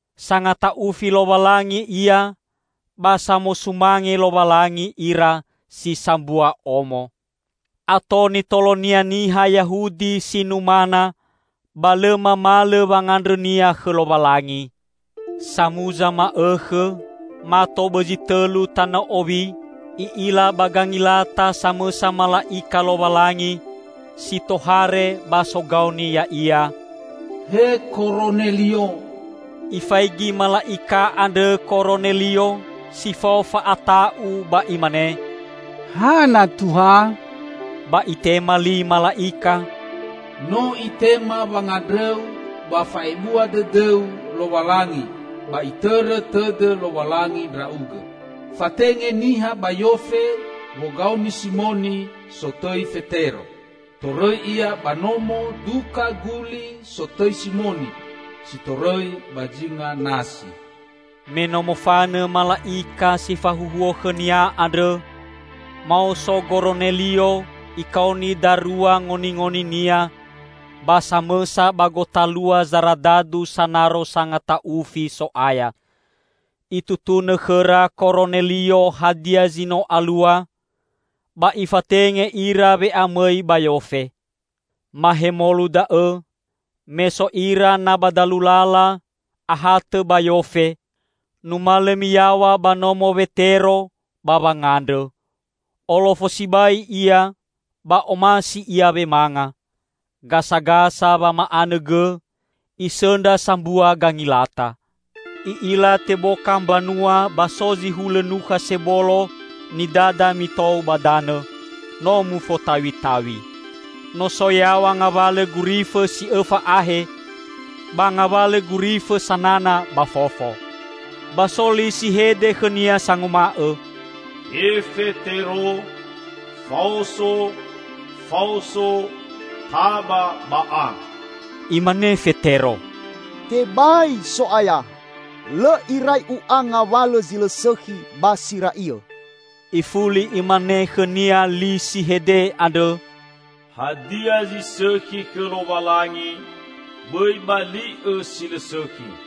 Sangata'ufi Lowalangi ia ba samosumange Lowalangi ira si sambua omo. Ato nitolonia niha Yahudi si numana, ba lõ mamalõ wangandrõnia khõ Lowalangi. Samuza ma'õkhõ mato bõzi tõlu tanõ owi i'ila ba gangilata samõsa mala'ika Lowalangi si tohare ba sogaoni ya'ia, "He Koronelio!" Ifaigi mala'ika andrõ Koronelio si fao fa'ata'u ba imane, "Hana Tuha?" Ba itema li mala'ika, "No itema wangandrõu ba fa'ebua dõdõu Lowalangi ba Itõrõ tõdõ Lowalangi ndra'ugõ. Fatenge niha ba Yofe wogaoni Simoni sotõi Fetero. Torõi ia ba nomo duka guli sotõi Simoni, si torõi ba zinga nasi." Me no mofanõ mala'ika si fahuhuo khõnia andrõ, maoso Goronelio ikaoni darua ngoningoninia ba samõsa ba gotalua zaradadu sanaro sangata'ufi So'aya. Itutunõ khõra Koronelio hadia zi no alua, ba ifatenge ira we'amõi ba Yofe. Mahemolu da'õ, me so ira na ba dalu lala ahatõ ba Yofe, numalõ miyaw̃a ba nomo Wetero ba wangandrõ. Olofo sibai ia ba omasi ia wemanga. Gasagasa wama'anõ gõ, isõndra sambua gangilata. I'ila teboka mbanua ba so zi hulõ nukha sebolo nidada mitou ba danõ, no mufotaw̃itaw̃i. No so yaw̃a ngawalõ gurifõ si õfa ahe, ba ngawalõ gurifõ sanana ba fofo. Ba so li si hede khõnia sanguma'õ, "He Fetero, faoso, faoso! Taba, ba a!" Imane Fetero, "Tebai, So'aya! Lõ irai u'a ngawalõ zi lõ sõkhi ba si ra'iõ." Ifuli imane khõnia li si hede andrõ, "Hadia zi sõkhi khõ Lowalangi, bõi bali'õ si lõ sõkhi."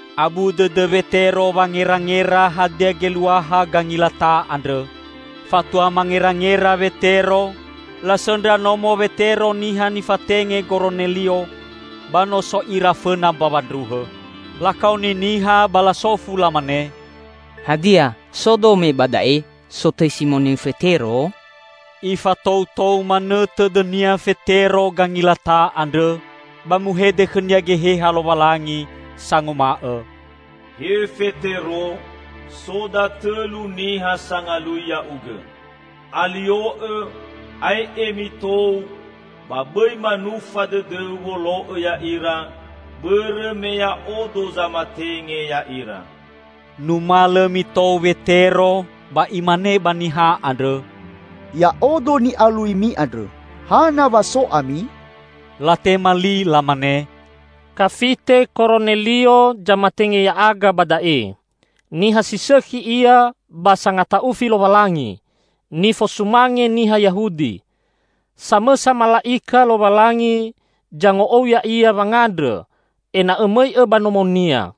Abu dõdõ Wetero wangerangera hadia geluaha gangilata andrõ. Fatua mangerangera Wetero, lasõndra nomo Wetero niha nifatenge Goronelio, ba no so ira fõna mbawa ndruhõ. Lakaoni niha ba lasofu lamane, "Hadia so dome ba da'e, sotõi Simoni Fetero?" Ifatoutou manõ tõdõnia Fetero gangilata andrõ, ba muhede khõnia Geheha Lowalangi sanguma'õ, "He Fetero, so datõlu niha sangalui ya'ugõ. Alio'õ ae'e mitou ba bõi manufa dõdõu wolo'õ ya'ira, bõrõ me Ya'odo zamatenge ya'ira." Numalõ mitou Wetero ba imane ba niha andrõ, "Ya'odo ni'aluimi andrõ. Hana wa so ami?" Latema li lamane, "Kafite Koronelio zamatenge ya'aga ba da'e. Niha si sõkhi ia ba sangata'ufi Lowalangi, nifosumange niha Yahudi. Samõsa mala'ika Lowalangi zango'ou ya'ia wangandrõ ena'õ mõi'õ ba nomonia,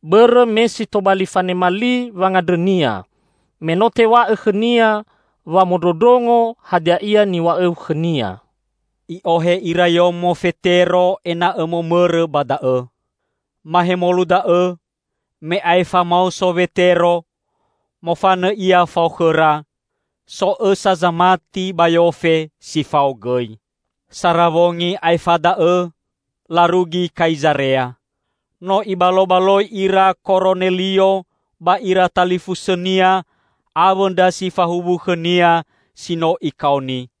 bõrõ me si tobali fanema li wangandrõnia, me no tew̃a'õ khõnia wamondrondrongo hadia ia niw̃a'õu khõnia." I'ohe ira yomo Fetero ena'õ momõrõ ba da'õ. Mahemolu da'õ, me aefa maoso Wetero, mofanõ ia fao khõra; so õsa zamati ba Yofe si fao gõi. Sara wongi aefa da'õ larugi Kaizarea. No ibalobaloi ira Koronelio ba ira talifusõnia awõ ndra si fahuwu khõnia si no ikaoni.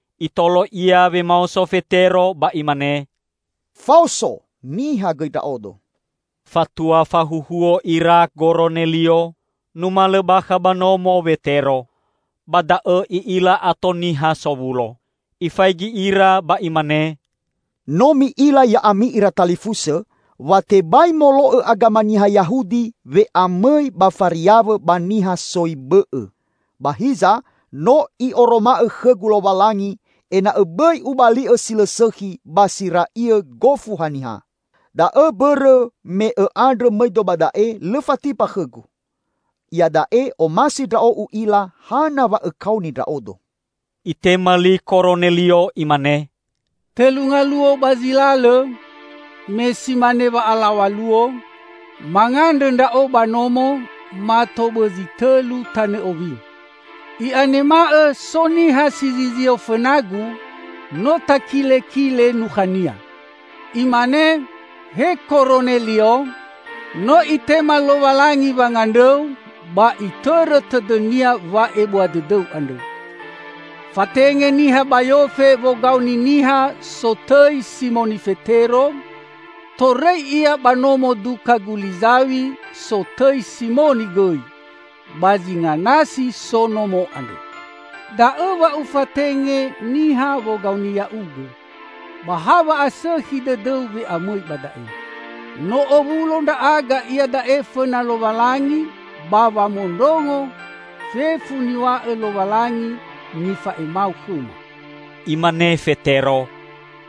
Itolo ia wemaoso Fetero ba imane, "Faoso! Niha gõi ndra'odo." Fatua fahuhuo ira Goronelio, numalõ bakha ba nomo Wetero. Ba da'õ i'ila ato niha sowulo. Ifaigi ira ba imane, "No mi'ila ya'ami ira talifusõ wa tebai molo'õ agama niha Yahudi we'amõi ba fariawõ ba niha soi bõ'õ. Ba hiza no I'oroma'õ khõgu Lowalangi ena'õ bõi ubali'õ si lõ sõkhi ba si ra'iõ gofu haniha. Da'õ mbõrõ me õ'andrõ mõido ba da'e lõ fatimba khõgu. Iada'e omasi ndra'o u'ila hana wa õkaoni ndra'odo." Itema li Koronelio imane, "Tõlu ngaluo ba zi lalõ, me si mane wa'alaw̃a luo, mangandrõ ndra'o ba nomo mato bõzi tõlu tanõ owi. I'anema'õ so niha si zizio fõnagu. No takitakile nukhania. Imane, 'He Koronelio! No Itema Lowalangi wangandrõu ba Itõrõ tõdõ-Nia wa'ebua dõdõu andrõ. Fatenge niha ba Yofe wogaoni niha sotõi Simoni Fetero. Torõi ia ba nomo duka guli zaw̃i sotõi Simoni gõi; ba zinga nasi so nomo andrõ.' Da'õ wa ufatenge niha wogaoni ya'ugõ. Ba ha wa'asõkhi dõdõu we'amõi ba da'e. No owulo ndra'aga iada'e fõna Lowalangi ba wamondrongo fefu niw̃a'õ Lowalangi nifa'emau khõma." Imane Fetero,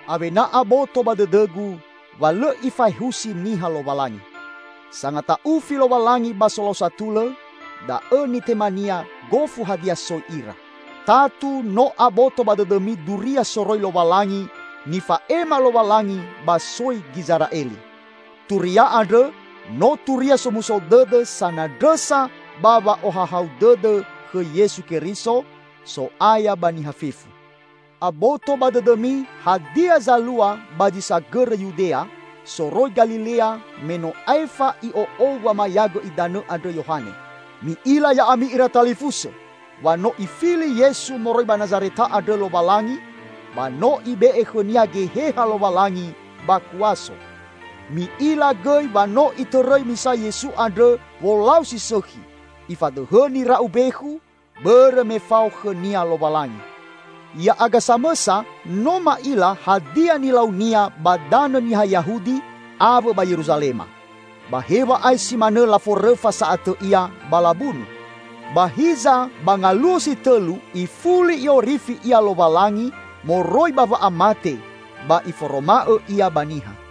"Awena aboto ba dõdõgu wa lõ Ifaehusi niha Lowalangi. Sangata'ufi Lowalangi ba solau satulõ, da'õ nitema-Nia gofu hadia soi ira. Tatu no aboto ba dõdõmi Duria soroi Lowalangi nifa'ema Lowalangi ba soi Gizera'eli. Turia andrõ no Turia Somuso Dõdõ sanandrõsa ba wa'ohahau dõdõ khõ Yesu Keriso, So'aya ba niha fefu. Aboto ba dõdõmi hadia zalua ba zi sagõrõ Yudea, soroi Galilea me no aefa i'o'ou wamayagõ idanõ andrõ Yohane. Mi'ila ya'ami ira talifusõ wa no Ifili Yesu moroi ba Nazareta andrõ Lowalangi ba no Ibe'e khõ-Nia Geheha Lowalangi ba kuaso. Mi'ila gõi wa no Itõrõi misa Yesu andrõ wolau si sõkhi; Ifadõhõ nira'u mbekhu, bõrõ me fao khõ-Nia Lowalangi. Ya'aga samõsa no ma'ila hadia nilau-Nia ba danõ niha Yahudi awõ ba Yeruzalema. Ba hew̃a'ae si manõ laforõfa sa'atõ Ia ba labunu. Ba hiza ba ngaluo si tõlu ifuli I'orifi Ia Lowalangi moroi ba wa'amate ba Iforoma'õ Ia ba niha;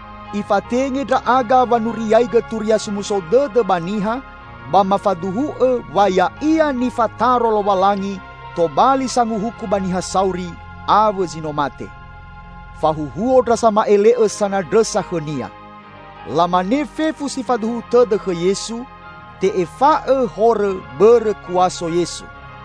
Ifatenge ndra'aga wanuriaigõ Turia Somuso Dõdõ ba niha ba mafaduhu'õ wa Ya'ia nifataro Lowalangi tobali Sanguhuku ba niha sauri awõ zi no mate. Fahuhuo ndra sama'ele'õ sanandrõsa khõ-Nia. Lamane fefu si faduhu tõdõ khõ Yesu, te'efa'õ horõ bõrõ kuaso Yesu."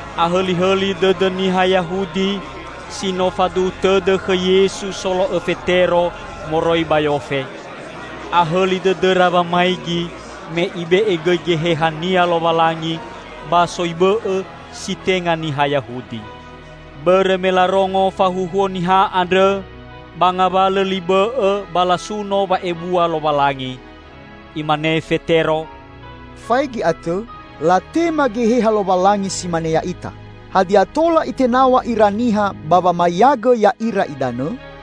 Ahõlihõli dõdõ niha Yahudi si no faduhu tõdõ khõ Yesu solo'õ Fetero moroi ba Yofe. Ahõli dõdõra wamaigi, me Ibe'e gõi Geheha-Nia Lowalangi ba soi bõ'õ si tenga niha Yahudi. Bõrõ me larongo fahuhuo niha andrõ ba ngawalõ li bõ'õ ba lasuno wa'ebua Lowalangi. Imane Fetero, "Faigi atõ, latema Geheha Lowalangi si mane ya'ita. Hadia tola itenaw̃a ira niha ba wamayagõ ya'ira idanõ?"